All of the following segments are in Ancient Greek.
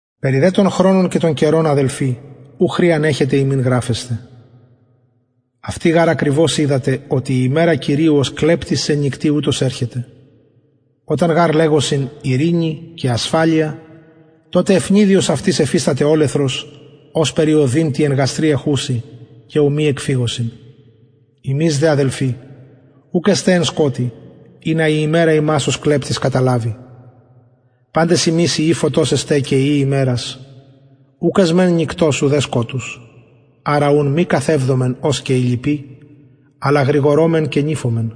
περι δε των χρονων και των καιρων αδελφοι ου χρειαν εχετε υμιν γραφεσθαι αυτοι γαρ ακριβως οιδατε οτι η ημερα κυριου ως κλεπτης εν νυκτι ουτως ερχεται οταν γαρ λεγωσιν ειρηνη και ασφαλεια τοτε αιφνιδιος αυτοις εφισταται ολεθρος ωσπερ η ωδιν τη εν γαστρι εχουση και ου μη εκφυγωσιν υμεις δε αδελφοι ουκ εστε εν σκοτει ινα η ημερα υμας ως κλεπτης καταλαβη παντες υμεις υιοι φωτος εστε και υιοι ημερας ουκ εσμεν νυκτος ουδε σκοτους αρα ουν μη καθευδωμεν ως και οι λοιποι αλλα γρηγορωμεν και νηφωμεν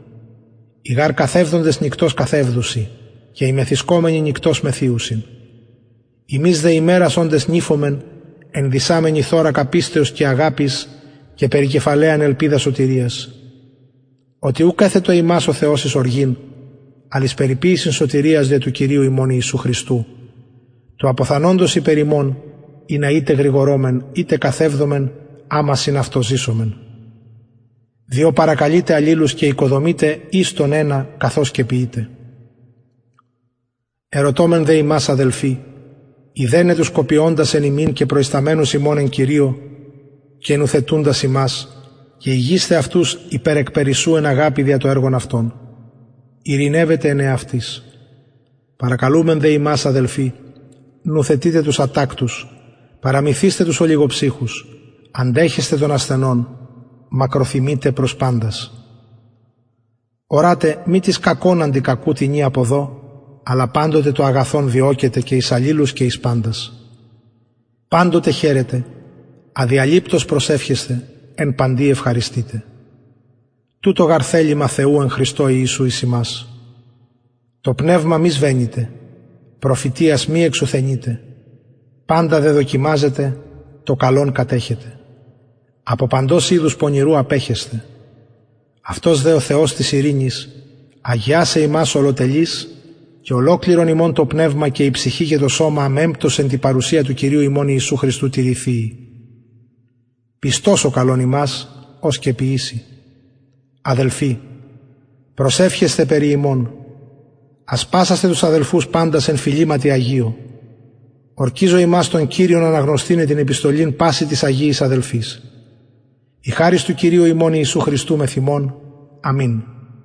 οι γαρ καθευδοντες νυκτος καθευδουσιν και οι μεθυσκομενοι νυκτος μεθυουσιν ημεις δε ημερας οντες νηφωμεν ενδυσαμενοι θωρακα πιστεως και αγαπης και περικεφαλαιαν ελπιδα σωτηριας οτι ουκ εθετο ημας ο θεος εις οργην αλλ εις περιποιησιν σωτηριας δια του κυριου ημων ιησου χριστου του αποθανοντος υπερ ημων ινα ειτε γρηγορωμεν ειτε καθευδωμεν αμα συν αυτω ζησωμεν διο παρακαλειτε αλληλους και οικοδομειτε εις τον ενα καθως και ποιειτε ερωτωμεν δε υμας αδελφοι ειδεναι τους κοπιωντας εν υμιν και προισταμενους υμων εν κυριω και νουθετουντας υμας και ηγεισθαι αυτους υπερ εκπερισσου εν αγαπη δια το εργον αυτων ειρηνευετε εν εαυτοις παρακαλουμεν δε υμας αδελφοι νουθετειτε τους ατακτους παραμυθεισθε τους ολιγοψυχους αντεχεσθε των ασθενων μακροθυμειτε προς παντας ορατε μη τις κακον αντι κακου τινι αποδω αλλα παντοτε το αγαθον διωκετε και εις αλληλους και εις παντας παντοτε χαιρετε αδιαλειπτως προσευχεσθε εν παντι ευχαριστειτε τουτο γαρ θελημα θεου εν χριστω ιησου εις υμας το πνευμα μη σβεννυτε προφητειας μη εξουθενειτε παντα δε δοκιμαζετε το καλον κατεχετε απο παντος ειδους πονηρου απεχεσθε αυτος δε ο θεος της ειρηνης αγιασαι υμας ολοτελεις και ολοκληρον υμων το πνευμα και η ψυχη και το σωμα αμεμπτως εν τη παρουσια του κυριου ημων ιησου χριστου τηρηθειη πιστος ο καλων υμας ος και ποιησει αδελφοι προσευχεσθε περι ημων ασπασασθε τους αδελφους παντας εν φιληματι αγιω ορκιζω υμας τον κυριον αναγνωσθηναι την επιστολην πασιν τοις αγιοις αδελφοις η χαρις του κυριου ημων ιησου χριστου μεθ υμων αμην